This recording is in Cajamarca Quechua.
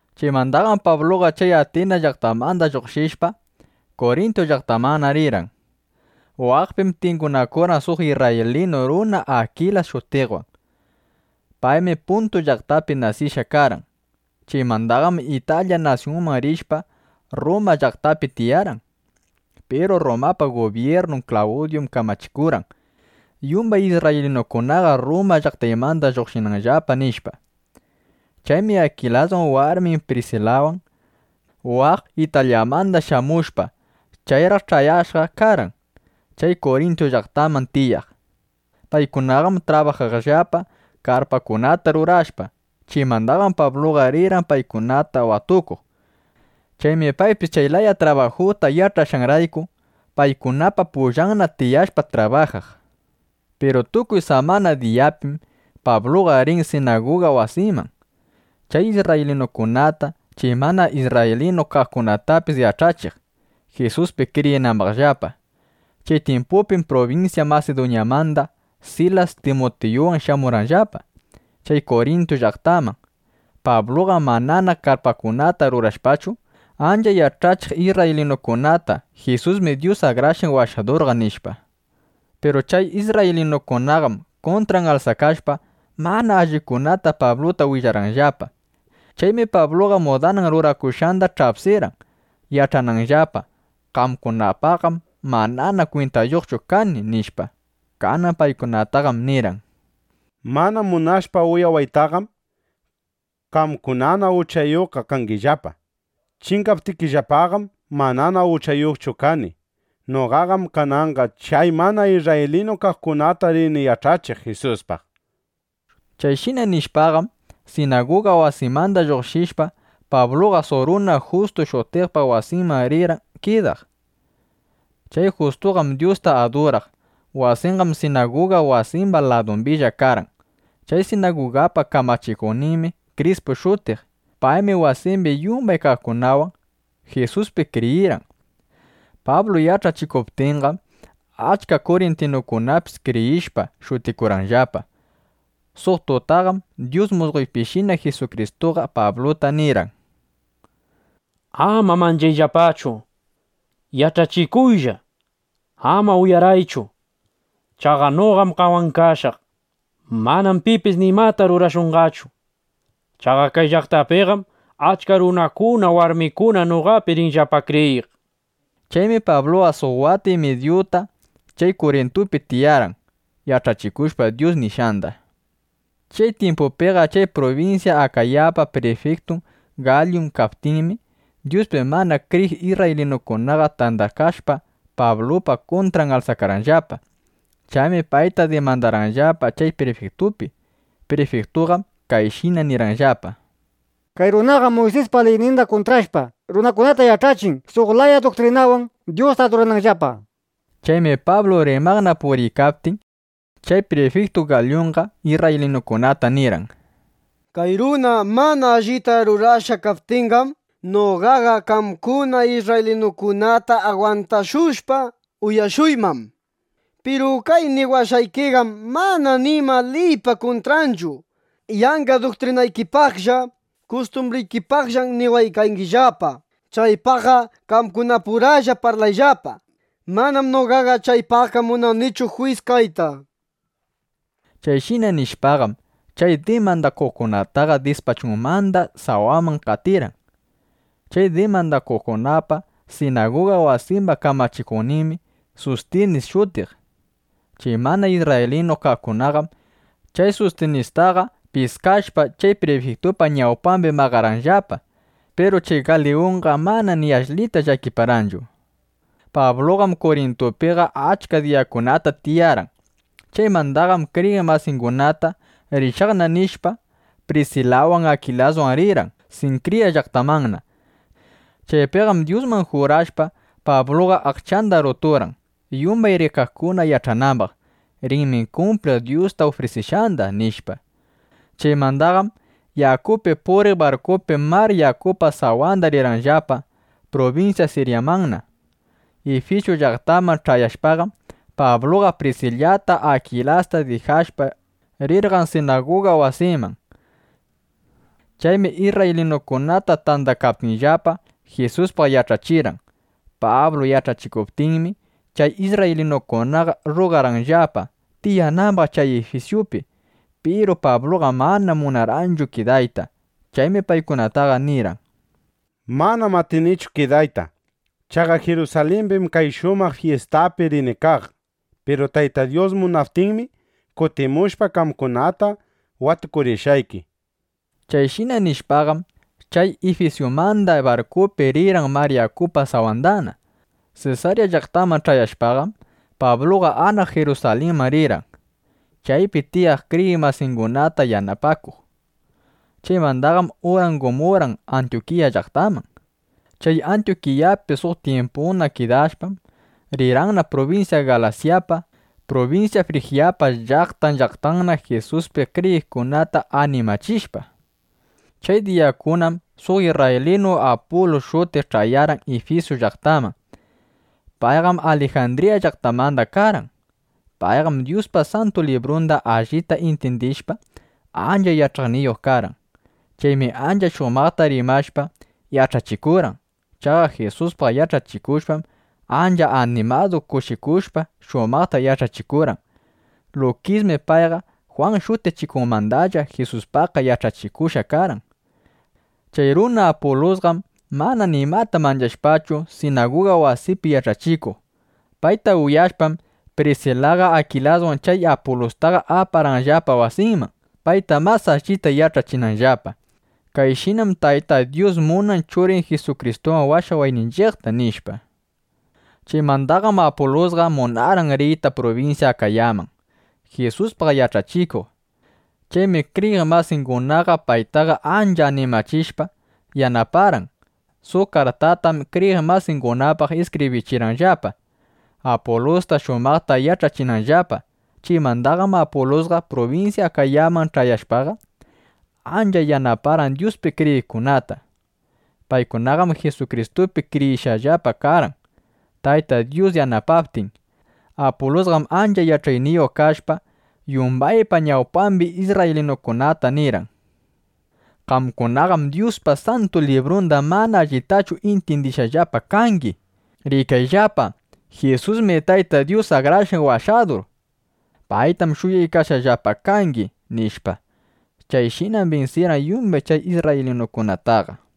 Chaymandaqam Pabluqa chay Atinas llaqtamanda lluqshishpa, Kurintu llaqtamanna rirqan. Waqpim tingunakurqan suq isrraylinu runa Akilas shutiqwan. Paymi Puntu llaqtapi nasishqa karqan. Chaymandaqam Italya nasyunman rishpa, Rruma llaqtapi tiyarqan. Piru Rrumapa gubyirnun Klawdyum kamachikurqan: —Yumbay isrraylinukunaqa Rruma llaqtaymanda lluqshinqallapa, nishpa. Chaymi Akilasqa warmin Prisilawan, waq Italyamanda shamushpa, chayraq ch'ayashqa karqan chay Kurintu llaqtaman tiyaq. Paykunaqam trabajaqllapa karpakunata rurashpa. Chaymandaqam Pabluqa rirqan paykunata watukuq. Chaymi paypis chay laya trabajuta yach'ashqanrayku, paykunapa pullanna tiyashpa trabajaq. Piru tukuy samana diyapim Pabluqa riq sinaguga wasiman, chay isrraylinukunata, chay mana isrraylinu kaqkunatapis yach'achiq, Jisuspi kriyinambaqllapa. Chay tyimpupim prubinsya Masiduñamanda Silas Timutiyuwan shamurqanllapa chay Kurintu llaqtaman. Pabluqam manana karpakunata rurashpachu, ancha yach'achiq isrraylinukunata: —Jisusmi Dyus Akrashqan Washadurqa, nishpa. Piru chay isrraylinukunaqam kuntran alsakashpa, mana allikunata Pabluta willarqanllapa. Chaymi Pabluqa mudanan rurakushqanda ch'apsirqan, yach'ananllapa: Qamkunapaqqam manana kwintayuqchu kani, nishpa. Kanan paykunataqam nirqan: —Mana munashpa uyawaytaqam, qamkunana uchayuqqa kangillapa. Chingaptikillapaqam manana uchayuqchu kani. Noqaqam kananqa chay mana isrraylinu kaqkunata rini yach'achiq Jisuspaq. Chayshina nishpaqam, sinaguga wasimanda lluqshishpa, Pabluqa suq runa Justu shutiqpa wasinman rirqan kidaq. Chay Justuqam Dyusta aduraq. Wasinqam sinaguga wasimba ladumbilla karqan. Chay sinagugapa kamachikuqninmi Krispu shutiq. Paymi wasimbi yumbay kaqkunawan Jisuspi kriyirqan. Pablu yach'achikuptinqam, achka kurintinukunapis kriyishpa, shutikurqanllapa. Suq tutaqam suq musqoypishina Jisukristuqa Pabluta nirqan: —Ama manchashpachu yach'achikuylla. Ama uyaraychu. Chaqa noqam qamwan kashaq. Manam pipis nimata rurashunqachu. Chaqa kay llaqtapiqam achka runakuna, warmikuna noqapi rinllapa kriyiq, nishpa. Chaymi Pabluqa suq wata y midyuta chay Kurintupi tiyarqan, yach'achikushpa Dyus nishqanda. Chay tyimpupiqa chay prubinsya Akayapa prifiktun Galyun kaptinmi, Jisuspi mana kriyiq isrraylinukunaqa tandakashpa, Pablupa kuntran alsakarqanllapa. Chaymi payta dimandarqanllapa chay prifiktupi. Prifiktutaqam kayshina nirqanllapa: —Kay runaqam Muysispa liyninda kuntrashpa, runakunata yach'achin, suq laya duktrinanwan Dyusta adurananllapa, nishpa. Chaymi Pablu rimaqna puriykaptin, chay prifiktu Galyunqa isrraylinukunata nirqan: —Kay runa mana allita rurashqa kaptinqam, noqaqa qamkuna isrraylinukunata agwantashushpa, uyashuyman. Piru kay niwashqaykiqam mana nima liypa kuntranchu. Yanqa duktrinaykipaqlla, kustumbrikipaqllam niwaykangillapa. Chaypaqqa qamkunapuralla parlayllapa. Manam noqaqa chaypaqqa munanichu juyis kayta. Chayshina nishpaqam, chay dimandakuqkunataqa dispachunmanda sawaman qatirqan. Chay dimandakuqkunapa sinaguga wasimba kamachikuqninmi Sustinis shutiq. Chay mana isrraylinu kaqkunaqam chay Sustinistaqa piskashpa, chay prifiktupa ñawpambi maqarqanllapa. Piru chay Galyunqa mana ni ashlita llakiparqanchu. Pabluqam Kurintupiqa achka diyakunata tiyarqan. Chaymandaqam kriyiq masingunata: “Rishaqna”, nishpa, Prisilawan, Akilaswan rirqan Sinkriya llaqtamanna. Chaypiqam Dyusman jurashpa, Pabluqa aqchanda ruturqan, yumbay rikaqkuna yach'anambaq: Rinmi kumpliq Dyusta ufrisishqanda, nishpa. Chaymandaqam yakupi puriq barkupi mar yakupa sawanda rirqanllapa prubinsya Siryamanna. Ifisu llaqtaman ch'ayashpaqam, Pabluqa Prisilata Akilasta dijashpa, rirqan sinaguga wasiman. Chaymi isrraylinukuna tandakaptinllapa, Jisuspaq yach'achirqan. Pablu yach'achiptinmi, chay isrraylinukunaqa rrugarqanllapa, tiyanambaq chay Ifisupi. Piru Pabluqam mana munarqanchu kidayta. Chaymi paykunataqa nirqan: —˻Manam atinichu kidayta. Chaqa Jirusalimbim kay shamuq fyistapi rini kaq.˼ Piru Tayta Dyus munaptinmi, kutimushpa, qamkunata watukurishqayki. Chayshina nishpaqam, chay Ifisumandaqa barkupi rirqan mar yakupa sawandana. Sesarya llaqtaman ch'ayashpaqam, Pabluqa anaq Jirusalinman rirqan, chaypi tiyaq kriyiq masingunata napaykuq. Chaymandaqam urangumurqan Antyukiya llaqtaman. Chay Antyukiyapi suq tyimputa kidashpam, rirqanna prubinsya Galasyapa prubinsya Frijyapa llaqtan, llaqtanna, Jisuspi kriyiqkunata animachishpa. Chay diyakunam suq isrraylinu Apulus shutiq ch'ayarqan Ifisu llaqtaman. Payqam Alijandriya llaqtamanda karqan. Payqam Dyuspa Santu Librunda allita intyindishpa, ancha yach'ayniyuq karqan. Chaymi ancha shumaqta rimashpa, yach'achikurqan. Chaqa Jisuspaq yach'akushpam, ancha animadu, kushikushpa, shumaqta yach'achikurqan. Lukismi payqa Jwan Shutichikuqmandalla Jisuspaqqa yach'akushqa karqan. Chay runa Apulusqam mana nimata manchashpachu, sinaguga wasipi yach'achikuq. Payta uyashpam, Prisilaqa Akilaswan chay Apulustaqa aparqanllapa wasinman, payta mas allita yach'achinanllapa: —Kayshinam Tayta Dyus munan Churin Jisukristuwan washawayninchiqta, nishpa. Chaymandaqam Apulusqa munarqan riyta prubinsya Akayaman, Jisuspaq yach'achikuq. Chaymi kriyiq masingunaqa paytaqa ancha animachishpa, yanaparqan. Suq kartatam kriyiq masingunapaq iskibrirqanllapa, Apulusta shumaqta ch'ayachinanllapa. Chaymandaqam Apulusqa prubinsya Akayaman ch'ayashpaqa, ancha yanaparqan Dyuspi kriyiqkunata. Paykunaqam Jisukristupi kriyishqallapa karqan, Tayta Dyus yanapaptin. Apulusqam ancha yach'ayniyuq kashpa, yumbaypa ñawpambi isrraylinukunataqa nirqan: —Qamkunaqam Dyuspa Santu Librundaqa mana allitachu intyindishqallapa kangi. Rikayllapa, Jisusmi Tayta Dyus Akrashqan Washadur. Paytam shuyaykashqallapa kangi, nishpa. Chayshinam binsirqan yumbay chay isrraylinukunataqa.